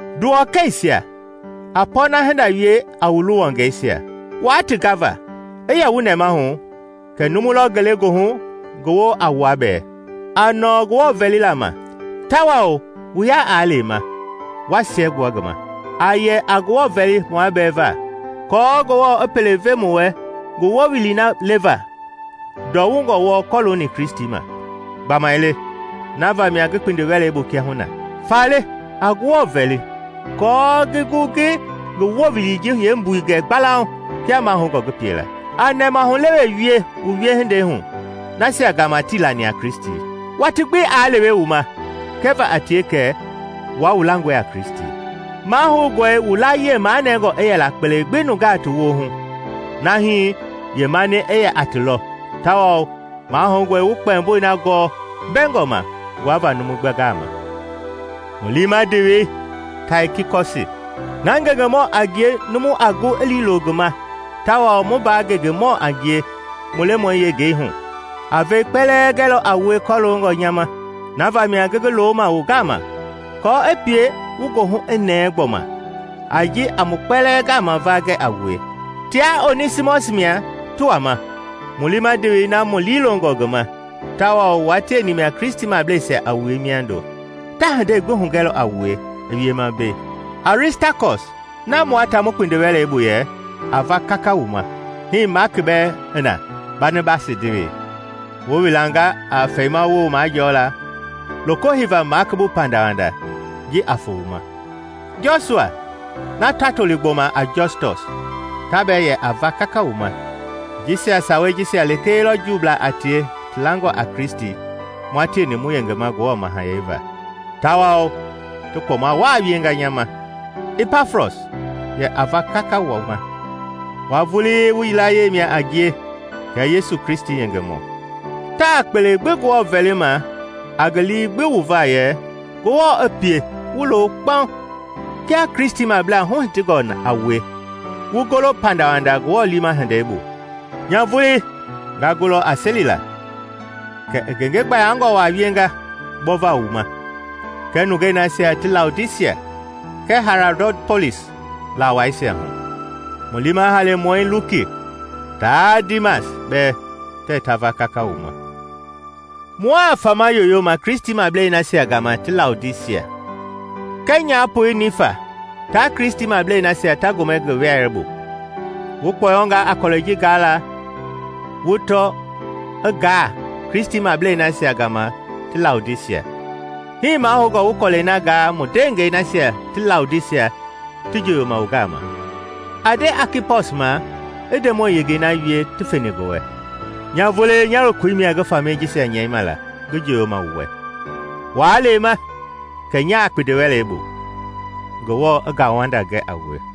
Nduwɔkɛisia, a pɔɔna-hinda wie a wu luwɔngɛisia, waa ti gava. I yɛ wu nɛmahu kɛ numu lɔ ngelegoohu ngi woo a wua bɛɛ. A nɔɔ Ngewɔ vɛlila ma, tawao wu ya aa lema, wa siɛgbua ngi ma. A yɛ a Ngewɔ vɛli muabɛɛ va kɔɔ Ngewɔ i pele ve mu wɛ ngi Wowili na leva ndɔwungɔ wɔɔ kɔlooni Kristi ma. Gbamaile na vamia ngi kpindiwɛlei bu kiahuna. Faale, a Ngewɔ vɛli kɔɔ ngi gu ngi ngi Wowili ji yeembui gɛ gbalauŋ kia mahoungɔ ngi pie la. A nɛmahulewe wie wu wiehindei hu nasia gama tii lani a Kristi, watii gbi aa lewe wu ma kɛva a tie kɛ wua wu langɔe a Kristi. Mahoungɔe wu layie manɛngɔ i yɛla kpele gbi nungaa woohu nahi yeemani i yɛ a ti lɔ, tawao mahoungɔe wu kpɛmboi na gɔɔ mbɛgɔma nguava numu gbi gama. Mu liima ndewei Taikikɔsi, na ngengemɔ a ngie numu a gu i liilo ngi ma tawao mu mbaa ngengemɔɔ a ngie mu Lemɔi yengei hu, a vɛi kpɛlɛɛ gɛlɔ a wue kɔloongɔ nya ma. Na vamia ngi ngi looma wu gama kɔɔ i pie wu goohu i nɛɛ gbɔma a ji a mu kpɛlɛɛ gama va gɛ a wue. Tia Onɛsimɔsi mia ti wama, mu liima ndewei na mu liilongɔ ngi ma, tawao wua tieni mia Kristimableisia a wue miando. Ta hindei gbi hugɛlɔ a wue i wiema mbei. Aristakɔs na mua ta mu kpindiwɛlei bu yɛ a va kaka wu ma, hii Maaki bɛɛ i na, Banabasi ndewei (Wu wilanga a fɛimawoo majɔɔla, loko heiva Maaki bu pandawanda ji a foo wu ma.) Jɔsua na ta toli gbɔma a Jɔstɔs, ta bɛɛ yɛ a va kaka wu ma. Jisia sawei jisia lekee lɔ Juublaa a tie ti langɔ a Kristi mua tieni mu yengema Ngewɔ Mahayɛi va, tawao ti kpɔma waa wienga nya ma. Ipafras yɛ a va kaka wu ma; wua vulii wu yilayee mia a ngie kɛɛ Yesu Kristi yengemɔ. Taa kpele gbi Ngewɔ vɛlima a ngi lii gbi wu va yɛ Ngewɔ i pie wu lo kpaŋ kia Kristimablaa huhitingɔngaa a wue, wu golo pandawanda Ngewɔ liima hindei bu. Nya vulii nga gulɔ a selila kɛ i ngenge gbayangɔ waa wienga gbɔva wu ma kɛɛ nungei nasia ti Laodisia kɛɛ Haiarapolis laa waisia hu. Mu liima Halemɔi Luki taa Diimas bɛɛ tɛɛ ta va kaka wu ma. Mua fama yoyoma Kristimablei nasia gama ti Laodisia, kɛɛ nyapoi Niifa taa Kristimablei nasia ta gomɛ ngi wɛleibu. Wu kpɔyɔngaa a kɔlɛi ji gaala wu tɔ i gaa Kristimablei nasia gama ti Laodisia. Hii mahoungɔ wu kɔlɛi na gaa mu ndeengɛi nasia ti Laodisia ti njoyoma wu gama. A nde Akipɔs ma i Ndemɔi yengei na wie ti feni ngi wɛ. Nya vulii nya lokoi mia ngi famɛi jisia nyɛima la ngi njoyoma wu wɛ. Waa lema kɛ nyaa kpindiwɛlei bu. Ngewɔ i ngauwanda gɛ a wue.